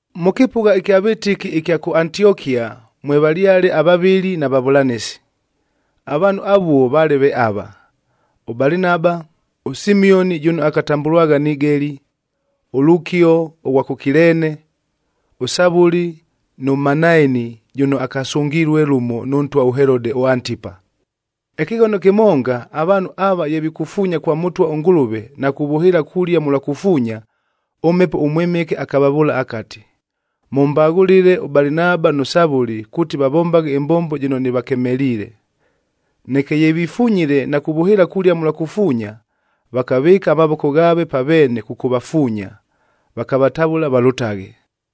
Mʉ kɨpʉgha ɨkya vɨtɨki ɨkya kʉ Antiokia mwevalyale avavɨli na vavʉlanɨsi. Avaanhu avuo vaale ve ava: ʉBalinaba, ʉSimioni jʉno akatambʉlwagha Nigeli,a ʉLukio ʉghwa kʉ Kileene, ʉSavʉli nʉ Manaeni jʉno akasʉngilue lʉmo nʉ ntwa ʉHelode ʉAntipa. Ɨkɨghono kɨmonga, avaanhu ava ye vikufuunya kwa Mʉtwa ʉNgʉlʉve na kuvʉhɨɨla kulia mʉlwa kufuunya,b ʉMhepo ʉMwɨmɨke akavavʉʉla akati, “Mʉmbaghʉlɨle ʉBalinaba nʉ Savʉli kuuti vavombaghe ɨmbombo jɨno nɨvakemeliile.” Neke ye vifunyile na kuvʉhɨɨla kulia mʉlwa kufuunya, vakavɨɨka amavoko ghaave pa veene kʉkʉvafuunya, vakavatavʉla valʉtaghe.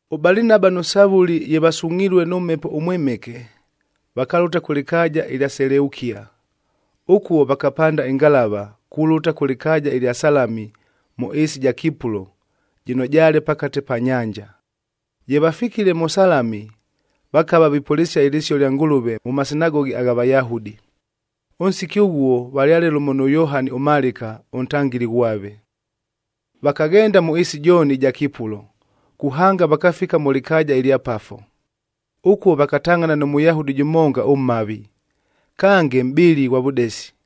ɄBalinaba nʉ Savʉli ye vasungʼhilue nʉ Mhepo ʉMwɨmɨke, vakalʉta kʉ lɨkaaja ɨlya Seleukia. Ʉkuo vakapanda ɨngalavac kulʉta kʉ lɨkaaja ɨlya Salami mʉ ɨɨsi ɨja Kipulo, jɨno jaale pakate pa nyanja. Ye vafikile mʉ Salami, vakava vipʉlɨsia ɨlɨsio lya Ngʉlʉve mʉ masinagogi agha Vayahudi. Ʉnsiki ʉghuo valyale lʉmo nʉ Yohani ʉMalɨka ʉntangɨli ghwave. Vakaghenda mʉ ɨɨsi jooni ɨja Kipulo, kuhanga vakafika mʉ lɨkaaja ɨlya Pafo. Ʉkuo vakatangʼhana nʉ Mʉyahudi jʉmonga ʉmhavi, kange mʼbɨli ghwa vʉdesi.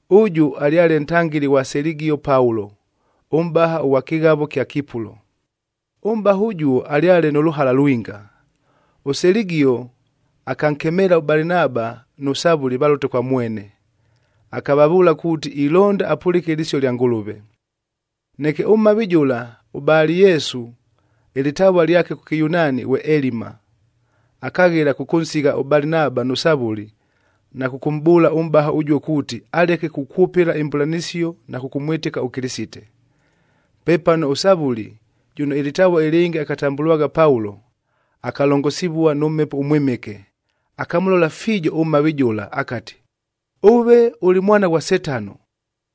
Ʉjʉ alyale ntangɨli ghwa Seligio Paulo, ʉmʼbaha ʉghwa kɨghavo ɨkya Kipulo. Ʉmʼbaha ʉjuo alyale nʉ lʉhala lwinga. ɄSeligio akankemeela ʉBalinaba nʉ Savʉli valʉte kwa mwene, akavavʉʉla kuuti ilonda apʉlɨke ɨlɨsio lya Ngʉlʉve. Neke ʉmhavi jʉla ʉBali-Yesu ɨlɨtavua lyake kʉ Kɨyunaani ghwe Elima, akaghela kʉkʉnsigha ʉBalinaba nʉ Savʉli, na kʉkʉmʼbʉʉla ʉmʼbaha ʉjuo kuuti, aleke kukwʉpɨla imbʉlanɨsio na kʉkʉmwɨtɨka ʉKɨlɨsite. Pepano ʉSavʉli,e jʉno ɨlɨtavua ɨlɨngɨ akatambʉlwagha Paulo, akalongosivua nʉ Mhepo ʉMwɨmɨke, akamʉlola fiijo ʉmhavi jʉla akati, “Ʉve ʉlɨ mwana ghwa Setano,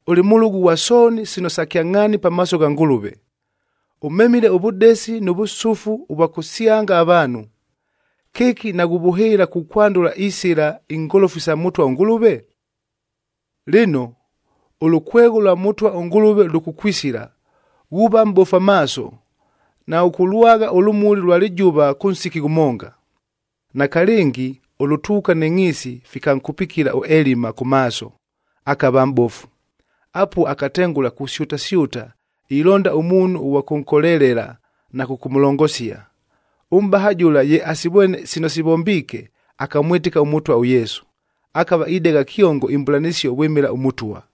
ʉlɨ mʉlʉgʉ ghwa sooni sino sa kyangʼhaani pamaaso gha Ngʉlʉve! Ʉmemile ʉvʉdesi nʉ vʉsʉfu ʉvwa kʉsyanga avaanhu. Kɨki naghuvʉhɨɨla kukwandʉla isɨla ingolofu isa Mʉtwa ʉNgʉlʉve? Lɨno, ʉlʉkwegho lwa Mʉtwa ʉNgʉlʉve lʉkʉkwisila, ghuuva mʼbofu amaaso, naghʉkʉlwagha ʉlʉmuli lwa lɨjʉva kʉ nsiki ghʉmonga.” Nakalɨngi ʉlʉtuuka nɨ ngʼhiisi fikankupikila ʉElima kʉ maaso, akava mʼbofu. Apuo akatengʉla kusyʉtasyʉta ilonda ʉmuunhu ʉghwa kʉnkolelela na kʉkʉmʉlongosia. Ʉmʼbaha jʉla ye asivwene sino sivombiike, akamwɨtɨka ʉMʉtwa ʉYesu. Akava idegha kyongo imbʉlanɨsio vwɨmɨla ʉMʉtwa.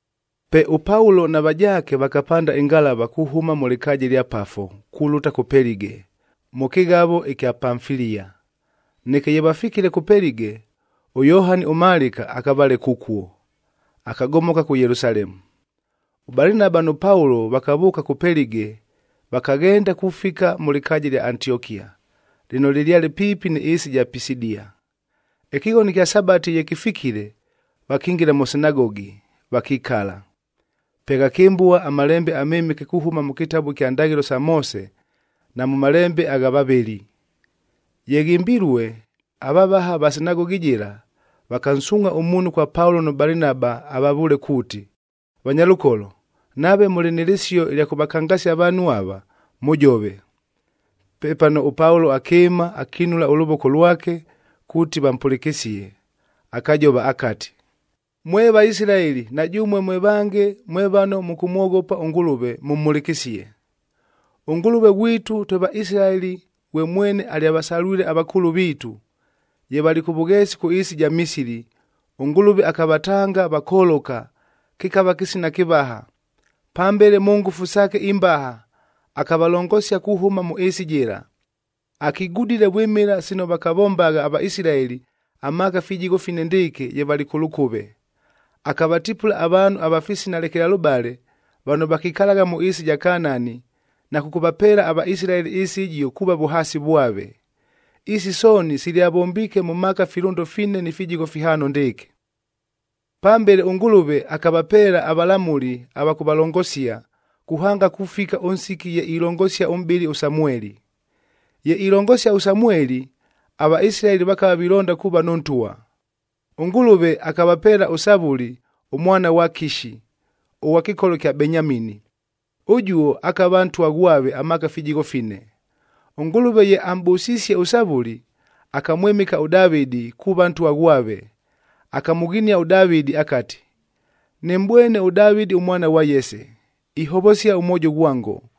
Pe ʉPaulo na vajaake vakapanda ɨngalava kuhʉma mʉ lɨkaaja ɨlya Pafo, kulʉta kʉ Pelige, mʉ kɨghavo ɨkya Pamfilia. Neke ye vafikile kʉ Pelige, ʉYohani ʉMalɨka akavaleka ʉkuo, akagomoka kʉ Yelusalemu. ɄBalinaba nʉ Paulo vakavʉʉka kʉ Pelige vakaghenda kufika mʉ lɨkaaja ɨlya Antiokia, lɨno lɨlyale piipi nɨ ɨɨsi ɨja Pisidia. Ɨkɨghono ɨkya Sabatif ye kɨfikile, vakingila mʉ sinagogi, vakikala. Pe ghakɨmbua aMalembe aMɨmɨke kuhʉma mʉ kɨtabu kya Ndaghɨlo sa Moose na mʉ malembe agha vavɨli. Ye ghɨmbilue, avavaha ava sinagogi jɨla vakansuungʼha ʉmuunhu kwa Paulo nʉ Balinaba avavʉʉle kuuti, “Vanyalʉkolo, nave mʉlɨ nɨ lɨsio ɨlya kʉvakangasia avaanhu ava, mʉjove.” Pepano, ʉPaulo akɨɨma, akinula ʉlʉvoko lwake kuuti vampʉlɨkɨsie, akajova akati, “Mwe Vaisilaeli na jʉmue mwe vange mwe vano mʉkʉmwoghopa ʉNgʉlʉve, mʉmhʉlɨkɨsie! ɄNgʉlʉve ghwitu twe Vaisilaeli ghwe mwene alyavasalwile avakʉʉlʉ viitu. Ye valɨ kʉ vʉgheesi kʉ ɨɨsi ɨja Misili, ʉNgʉlʉve akavatanga vakoloka, kɨkava kɨsina kɨvaha. Pambele mʉ ngʉfu saake imbaha akavalongosia kuhʉma mʉ ɨɨsi jɨla. Akigudile vwɨmɨla sino vakavombagha aVaisilaeli amaaka fijigho fine ndɨɨkɨ ye valɨ kʉ lʉkʉve. Akavatipula avaanhu ava fisina lekelalʉbale vano vakikalagha mʉ ɨɨsi ɨja Kanaani na kʉkʉvapeela aVaisilaeli ɨɨsi ɨjio kuuva vʉhaasi vwave. Isi sooni silyavombiike mʉ maaka filʉndo fine ni fijigho fihaano ndɨɨkɨ. “Pambele ʉNgʉlʉve akavapeela avalamʉli ava kʉvalongosia, kuhanga kufika ʉnsiki ye ilongosia ʉmʼbɨli ʉSamueli. Ye ilongosia ʉSamueli, aVaisilaeli vakava vilonda kuuva nʉ ntwa. ɄNgʉlʉve akavapeela ʉSavʉli ʉmwana ghwa Kishi, ʉghwa kɨkolo kya Benyamini. Ʉjuo akava ntwa ghwave amaaka fijigho fine. ɄNgʉlʉve ye amʼbʉsisie ʉSavʉli, akamwɨmɨka ʉDavɨdi kuuva ntwa ghwave. Akamʉghinia ʉDavɨdi akati, ‘Nɨmʼbwene ʉDavɨdi ʉmwana ghwa Yese, ihovosia ʉmwojo ghwango,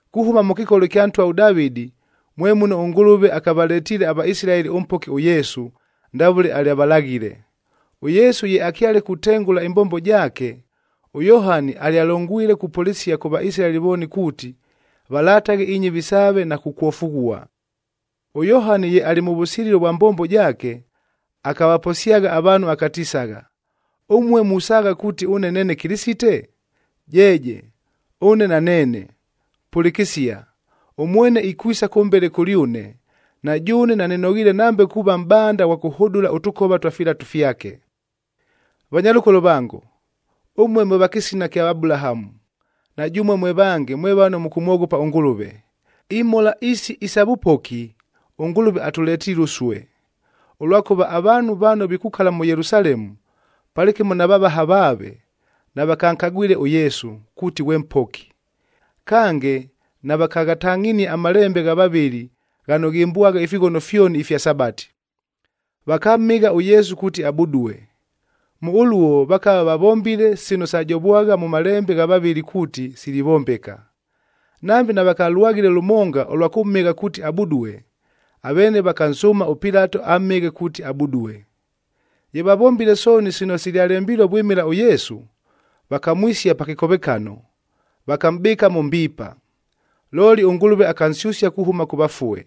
“Kuhʉma mʉ kɨkolo ɨkya ntwa ʉDavɨdi mwe muno ʉNgʉlʉve akavaletiile aVaisilaeli ʉMpoki ʉYesu, ndavʉle alyavalaghile. ɄYesu ye akyale kutengʉla ɨmbombo jaake, ʉYohani alyalongwile kupʉlɨsia kʉ Vaisilaeli vooni kuuti, valataghe inyɨvi saave na kukwofughua. ɄYohani ye alɨ mʉ vʉsililo vwa mbombo jaake, akavaposyagha avaanhu akatisagha, ‘Ʉmue musaagha kuuti ʉne neene Kɨlɨsite? Jeeje, ʉne naneene. Pʉlɨkɨsia, ʉmwene ikwisa kʉmbele kʉlyʉne, na jʉʉne nanɨnoghiile nambe kuuva mʼbanda ghwa kʉhʉdʉla ʉtʉkova twa filatu fyake.’ “Vanyalʉkolo vango, ʉmue mwe va kɨsina kya Abulahamu, na jʉmue mwe vange mwe vano mʉkʉmwoghopa ʉNgʉlʉve, imhola isi isa vʉpoki, ʉNgʉlʉve atʉletiile ʉsue. Ʉlwakʉva avaanhu vano vikukala mʉ Yelusalemu, palɨkɨmo na vavaha vaave, navakankagwile ʉYesu, kuuti ghwe Mpoki. Kange, navakaghatangʼhinie amalembe gha vavɨli ghano ghɨmbwagha ifighono fyoni ifya Sabati. Vakamhɨgha ʉYesu kuuti abudue. Mʉ ʉluo, vakava vavombile sino sajovwagha mʉ malembe gha vavɨli kuuti silivombeka. Nambe navakalwaghile lʉmonga ʉlwa kʉmhɨgha kuuti abudue, aveene vakansʉʉma ʉPilato amhɨghe kuuti abudue. Ye vavombile sooni sino silyalembilue vwɨmɨla ʉYesu, vakamwisia pa kɨkovekano, vakamʼbɨɨka mʉ mbiipa. Looli ʉNgʉlʉve akansyʉsia kuhʉma kʉ vafue.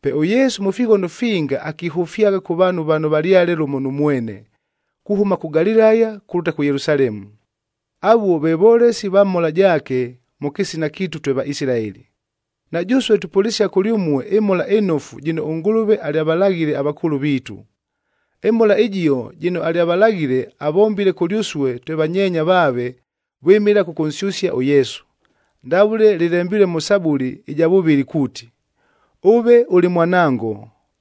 Pe ʉYesu mʉ fighono finga akihʉfyagha kʉ vaanhu vano valyale lʉmo nʉ mwene,h kuhʉma kʉ Galilaya kulʉta kʉ Yelusalemu. Avuo ve volesi va mhola jaake mʉ kɨsina kiitu twe Vaisilaeli. Na jʉsue tupʉlɨsia kʉlyʉmue ɨMhola ɨNofu jɨno ʉNgʉlʉve alyavalaghile avakʉʉlʉ viitu. ƗMhola ɨjio jɨno alyavalaghile, avombile kʉlyʉsue twe vanyeenya vaave vwɨmɨla kʉkʉnsyʉsia ʉYesu, ndavʉle lɨlembilue mʉ Sabuli ɨja vʉvɨlɨ kuuti, ‘Ʉve ʉlɨ Mwanango,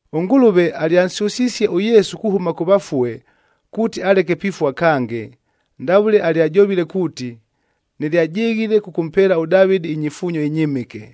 “ɄNgʉlʉve alyansyʉsisie ʉYesu kuhʉma kʉ vafue kuuti aleke pifua kange, ndavʉle alyajovile kuuti, ‘Nɨlyajɨghile kʉkʉmpeela ʉDavɨdi inyifuunyo inyɨmɨke,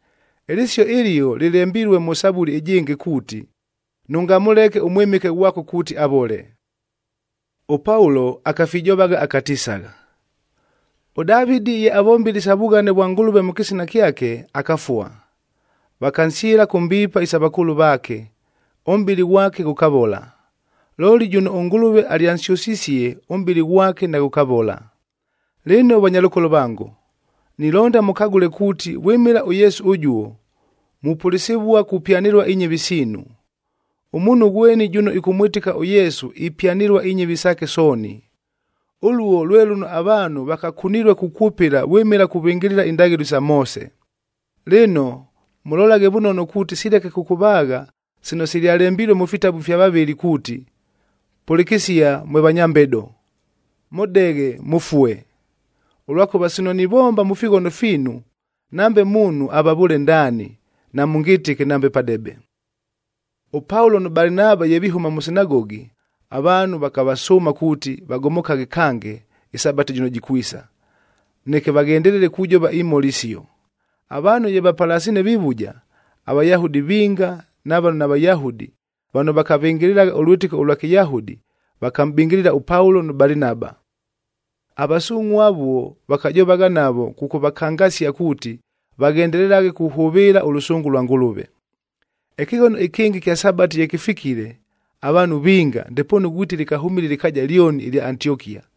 “Ɨlɨsio ɨlio lɨlembilue mʉ Sabuli ɨjɨngɨ kuuti, ‘Nʉngamʉleke ʉMwɨmɨke ghwako kuuti avole.’k” ɄPaulo akafijovagha akatisagha, “ɄDavɨdi ye avombile isa vughane vwa Ngʉlʉve mʉ kɨsina kyake, akafua. Vakansyɨla kʉ mbiipa isa vakʉʉlʉ vaake, ʉmʼbɨlɨ ghwake ghʉkavola. Looli jʉno ʉNgʉlʉve alyansyʉsisie, ʉmʼbɨlɨ ghwake naghʉkavola. “Lɨno vanyalʉkolo vango, nilonda mʉkagʉle kuuti vwɨmɨla ʉYesu ʉjuo, mupʉlɨsɨvua kupyanɨlua inyɨvi siinu. Ʉmuunhu ghweni jʉno ɨkʉmwɨtɨka ʉYesu ipyanɨlua inyɨvi saake sooni. Ʉluo lwe lʉno avaanhu vakakunilue kukwʉpɨla vwɨmɨla kuvɨngɨlɨla indaghɨlo isa Moose. Lɨno, mʉlolaghe vʉnono kuuti sileke kʉkʉvaagha sino silyalembilue mʉ fitabu ifya vavɨli kuuti, ‘Pʉlɨkɨsia mwe vanya mbedo, mʉdeghe, mʉfue. Ʉlwakʉva sino nivomba mʉ fighono fiinu, nambe ʉmuunhu avavʉʉle ndaani, namʉngɨtɨke nambe padebe.’l” ɄPaulo nʉ Balinaba ye vihʉma mʉ sinagogi, avaanhu vakavasʉʉma kuuti, vagomokaghe kange ɨSabati jɨno jikwisa, neke vaghendelele kujova imhola isio. Avaanhu ye vapalasiine vivuja, aVayahudi vinga na vano naVayahudi vano vakavɨngɨlɨlagha ʉlwɨtɨko ʉlwa Kɨyahudi, vakamʼbɨngɨlɨla ʉPaulo nʉ Balinaba. Avasungʼhua avuo vakajovagha navo kʉkʉvakangasia kuuti, vaghendelelaghe kuhʉvɨɨla ʉlʉsʉngʉ lwa Ngʉlʉve. Ɨkɨghono ɨkɨngɨ ɨkya Sabati ye kɨfikile, avaanhu vinga, ndepoonu ghwiti lɨkahʉmile ɨlɨkaaja lyoni ɨlya Antiokia,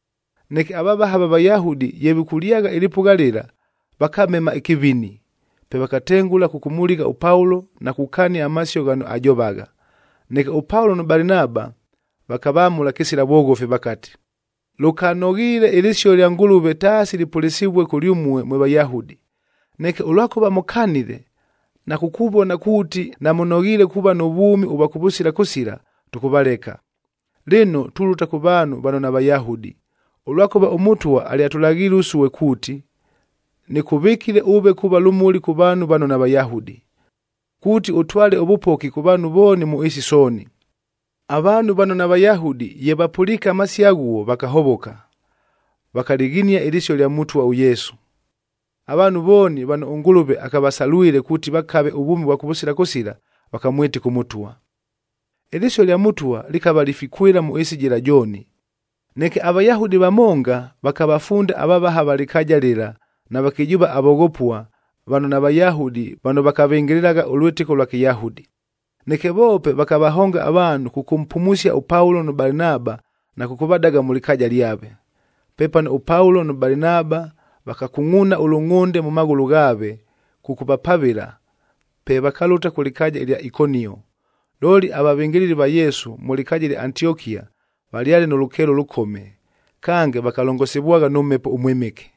Neke avavaha va Vayahudi ye vikʉlyagha ɨlɨpʉgha lɨla, vakamema ɨkɨvini. Pe vakatengʉla kʉkʉmʉligha ʉPaulo na kukania amasio ghano ajovagha. Neke ʉPaulo nʉ Balinaba vakavamʉla kɨsila vwoghofi vakati, “Lʉkanoghiile ɨlɨsio lya Ngʉlʉve taasi lɨpʉlɨsɨvue kʉlyʉmue mwe Vayahudi. Neke ʉlwakʉva mʉkanile, na kukuvona kuuti, namʉnoghiile kuuva nʉ vwʉmi ʉvwa kʉvʉsila kʉsila, tʉkʉvaleka. Lɨno, tulʉta kʉ vaanhu vano naVayahudi, ʉlwakʉva ʉMʉtwa alyatʉlaghiile ʉsue kuuti, ‘Nɨkʉvɨkile ʉve kuuva lʉmuli kʉ vaanhu vano naVayahudi, kuuti ʉtwale ʉvʉpoki kʉ vaanhu vooni mʉ ɨɨsi sooni.’n” Avaanhu vano naVayahudi ye vapʉliike amasio aghuo, vakahovoka, vakalɨghinia ɨlɨsio lya Mʉtwa ʉYesu. Avaanhu vooni vano ʉNgʉlʉve akavasalwile kuuti vakave ʉvwʉmi ʉvwa kʉvʉsila kʉsila, vakamwɨtɨka ʉMʉtwa. Ɨlɨsio lya Mʉtwa lɨkava lifikwɨla mʉ ɨɨsi jɨla jooni. Neke aVayahudi vamonga vakavafunda avavaha va lɨkaaja lɨla na vakɨjʉʉva avoghopua vano naVayahudi vano vakavɨngɨlɨlagha ʉlwɨtɨko ʉlwa Kɨyahudi. Neke voope vakavahonga avaanhu kʉkʉmpumusia ʉPaulo nʉ Balinaba na kʉkʉvadaga mʉ lɨkaaja lyave. Pepano ʉPaulo nʉ Balinaba vakakungʼuuna ʉlʉngʼhʉnde mʉ maghʉlʉ ghaave kʉkʉvapavɨla, pe vakalʉta kʉ lɨkaaja ɨlya Ikonio. Looli avavɨngɨlɨli va Yesu mʉ lɨkaaja ɨlya Antiokia valyale nʉ lʉkeelo ʉlʉkome, kange vakalongosivwagha nʉ Mhepo ʉMwɨmɨke.